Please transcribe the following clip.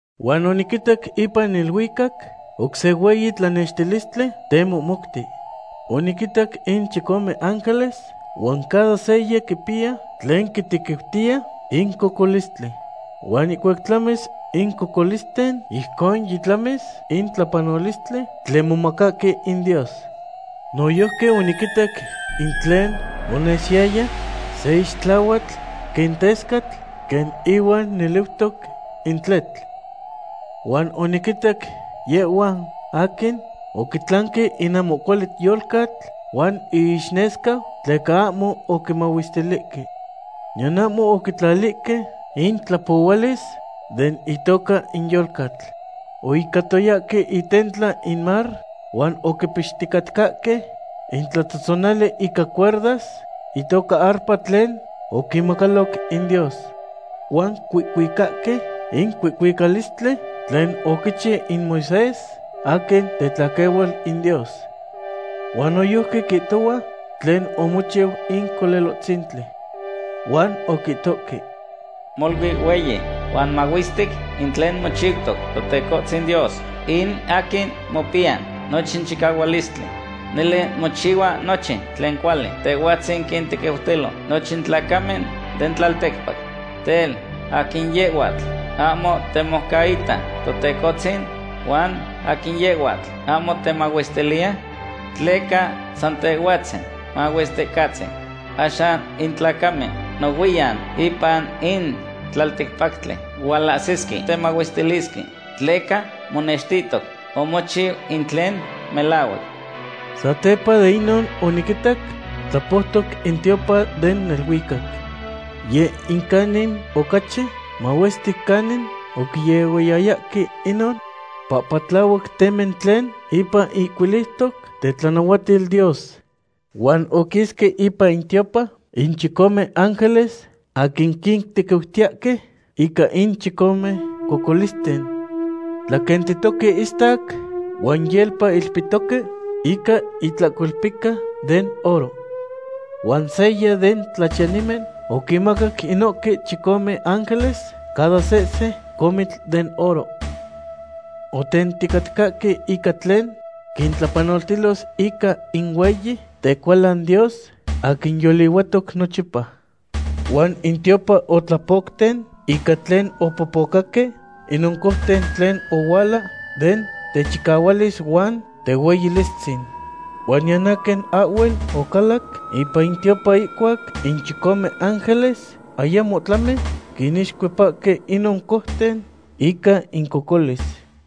Huan oniquitac ipan neluicac oc se hueyi tlanextilistli temohmouti. Oniquinitac in chicome ángeles huan cada seya quipiya tlen quitequiutiya in cocolistli. Huan ihcuac tlamis in cocolisten, ijcon yitlamis in tlapanolistli tlen momacahque in Dios. Noyojqui oniquitac in tlen onesiyaya se ixtlahuatl quen tescatl quen ihuan neliutoc in tletl. Huan oniquinitac yehhuan aquin oquitlanque in ahmo cuali yolcatl huan iixnesca, tleca ahmo oquimahuestilihque. Niyan ahmo oquitlalihque in tlapohualis den itoca in yolcatl. Oihcatoyahque itentla in mar huan oquipixticatcahque intlatzotzonali ica cuerdas itoca arpa tlen oquinmacaloc in Dios. Huan cuihcuicahque in cuihcuicalistli tlen oquichiu in Moisés aquin tetlaquehual in Dios. Huan noyojqui quihtohua tlen omochiu in Colelohtzintli. Huan oquihtohque: Molui hueyi huan mahuestic in tlen mochiutoc, Totecohtzin Dios, in aquin mopiya nochin chicahualistli. Nele mochihua nochin tlen cuali. Tehhuatzin quintequiutilo nochin tlacamen den tlalticpac. Tel, ¿aquin yehhuatl ahmo temoucaita, Totecohtzin? Huan, ¿aquin yehhuatl ahmo temahuestiliya? Tleca san Tehhuatzin Mahuesticatzin. Axan in tlacamen nohuiyan ipan in tlalticpactli hualahsisque temahuestilisque, tleca monextihtoc omochiu in tlen melahuac. Satepa de inon oniquitac tlapoutoc in tiopan den neluicac. Yeh in canin ocachi mahuestic canin oquiehuayayahque inon pahpatlahuac temen tlen ipan ihcuiliutoc tetlanahuatil Dios. Huan oquisque ipan in tiopan in chicome ángeles aquin quintequiutiyahque ica in chicome cocolisten. Tlaquentitoque ihistac huan yelpa ilpihtoque ica itlahcolpica den oro. Huan seya den tlachiyanimen oquinmacac inohque chicome ángeles cada sehse comitl den oro. Otenticatcahque ica tlen quintlapanoltilos ica in hueyi tecualan Dios, aquin yolihuatic nochipa. Huan in tiopan otlapocten ica tlen opopocaque inon conten tlen ohuala den techicahualis huan tehueyilistzin. Huan niyan aquin ahhuel ocalac ipan in tiopan ihcuac in chicome ángeles ayamo tlami quinixcuepahque inon conten ica incocolis.